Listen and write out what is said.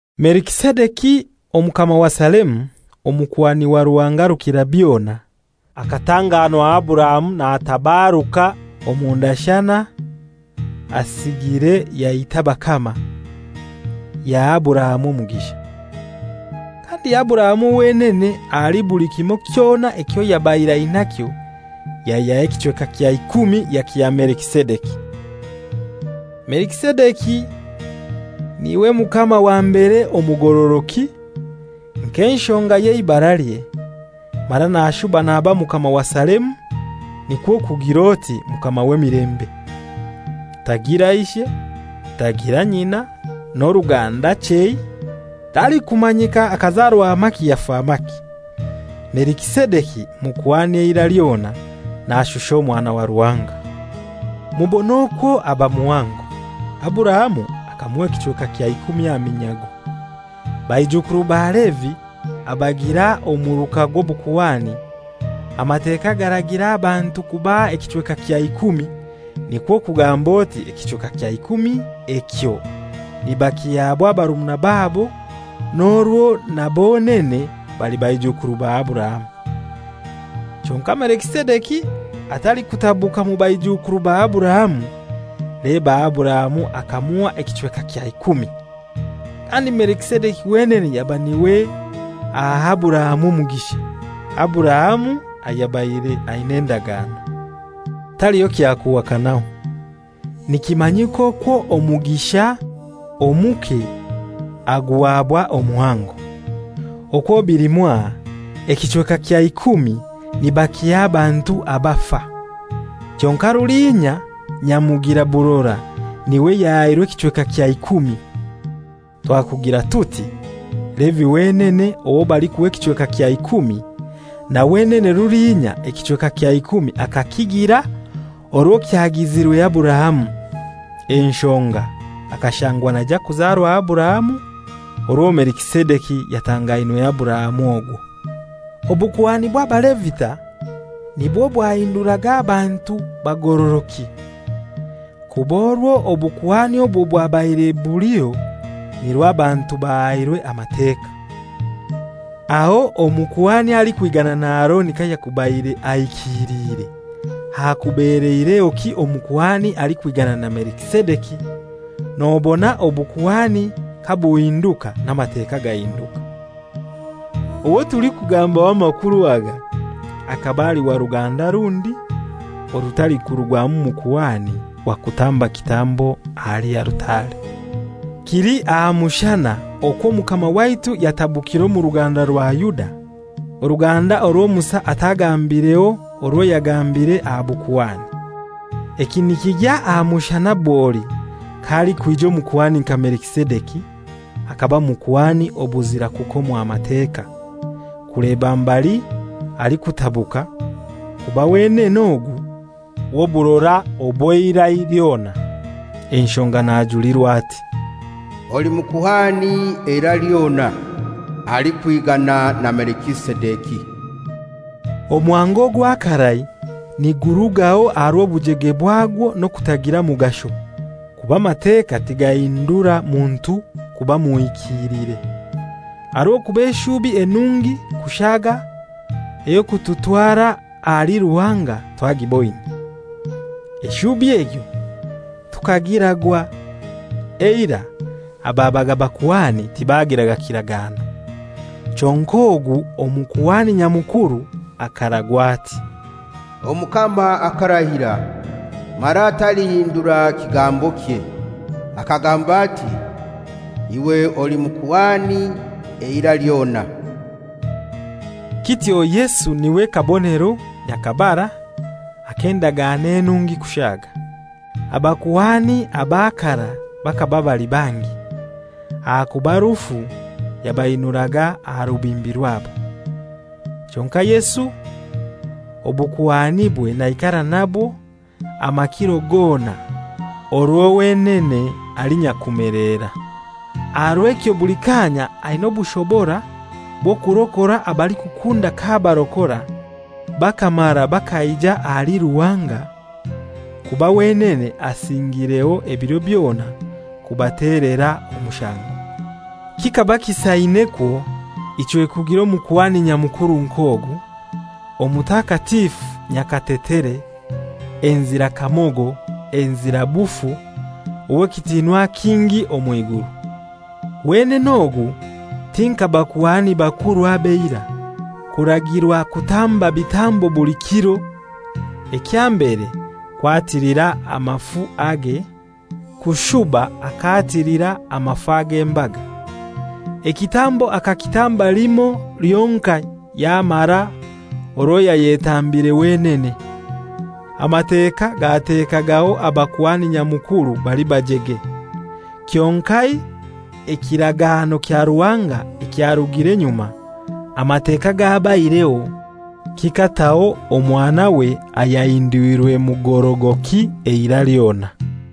Melikisedeki, omukama wa Salemu, omukuhani wa Ruhanga Rukirabyona, akatanganwa Aburahamu natabaruka omu ndashana asigire yaita abakama, yaha Aburahamu omugisha. Kandi Aburahamu wenene ahali buli kimoi kyona ekyo yabaire ainakyo yaihyaho ekichweka kya ikumi yakiha Melikisedeki. Melikisedeki n'iwe mukama wa mbere omugorogoki, nk'enshonga y'eibaralye, mara nashuba naba mukama wa Salemu, nikwo kugir'oti, «Mukama w'emilembe.» Tagira ishe, tagira nyina, n'oruganda chei, talikumanyika akazarwa maki yafa maki. Melikisedeki mukuhani eira lyona, nashusha Omwana wa Ruhanga. Mubone okwo aba muhango! Aburahamu akamuha ekichweka kya ikumi aha minyago. Baijukuru ba Levi abagira omuruka gw'obukuhani, Amateka garagira abantu kubaha ekichweka kya ikumi, nikwo kugamba oti ekichweka kya ikumi ekyo nibakihabwa barumuna babo n'orwo na bonene bali baijukuru ba Aburahamu. Kyonkai Melikisedeki atalikutabuka mu baijuukuru ba Aburahamu, leba Aburahamu akamuha ekichweka kya ikumi, kandi Melikisedeki wenene yaba n'iwe aha Aburahamu omugisha, Aburahamu ayabaire aina endagano. Taliho kya kuhakanaho, nikimanyika okwo omugisha omuke aguhabwa omuhango. Okwo bili mwaha, ekichweka kya ikumi nibakiha abantu abafa, kyonkai rulinya, nyamugira burora n'iwe yahairwe ekichweka kya ikumi. Twakugira tuti Levi wenene owo balikuha ekichweka kya ikumi, na wenene rulinya ekichweka kya ikumi akakigira orwo kyagizirwe Aburahamu, enshonga akashangwa naija kuzarwa Aburahamu orwo Melikisedeki yatangainwe Aburahamu ogwo. Obukuhani bw'Abalevita nibwo bwahinduraga abantu bagorogoki (kuba orwo obukuhani obwo bwabaire buliho nirwo abantu bahairwe Amateka.) Aho omukuhani alikwigana na Aroni kayakubaire ahikiliire hakubeleirehoki omukuhani alikwigana na Melikisedeki? Nobona obukuhani kabuhinduka n'Amateka gahinduka. Owo tulikugambaho amakuru aga akaba ali wa ruganda rundi orutalikurugwamu mukuhani wa kutamba kitambo ahali altare. Kili aha mushana okwo Omukama waitu yatabukire omu ruganda rwa Yuda, oruganda orwo Musa atagambireho orwo yagambiire aha bakuhani. Eki nikigya aha mushana bwoli k'alikwija omukuhani nka Melikisedeki, akaba mukuhani obuzira kukomwa Mateka, kuleba mbali alikutabuka, kuba wenene ogu w'oburora obw'eira lyona. Enshoga najulirwa ati, «Oli mukuhani eira lyona, alikwigana na Melikisedeki.» Omuhango ogwa karai nigurugaho aha rw'obujege bwagwo n'okutagira mugasho (kuba Amateka tigahindura muntu kuba muhikiilire); aha rw'okuba eshubi enungi kushaaga ey'okututwara ahali Ruhanga twagiboine. Eshubi egyo tukagiragwa. Eirai ababaga bakuhani tibagiraga kiragano. Kyonkai ogu Omukuhani Nyamukuru akaragwa ati, «Omukama akarahira, mara talihindura kigambokye, akagamba ati, ‹Iwe oli mukuhani eira lyona.›» Kityo Yesu n'iwe kabonero nyakabara ak'endagano enungi kushaaga. Abakuhani aba karai bakaba bali bangi, ahakuba rufu yabainuraga aha rubimbi rwabo. Kyonkai Yesu obukuhanibwe naikara nabwo amakiro gona, orwo wenene ali nyakumelera. Aha rw'ekyo buli kaanya aina obushobora bw'okurokora abalikukunda k'abarokora bakamara bakaija ahali Ruhanga, kuba wenene asingireho ebiro byona kubatelera omushango. Kikaba kisainekwo ichwe kugira Omukuhani Nyamukuru nk'ogu, omutakatifu nyakatetere, enzira kamogo, enzira bufu, ow'ekitinwa kingi omw'iguru. Wenene ogu ti nka bakuhani bakuru ab'eira, kuragirwa kutamba bitambo buli kiro, ekya mbere kwatilira amafu age, kushuba akatilira amafu ag'embaga. Ekitambo akakitamba limoi lyonkai yamara orwo yayetambire wenene. Amateka gatekagaho Abakuhani Nyamukuru bali bajege; kyonkai ekiragano kya Ruhanga ekyarugire nyuma, Amateka gabaireho, kikataho Omwanawe ayahindwirwe mugorogoki eira lyona.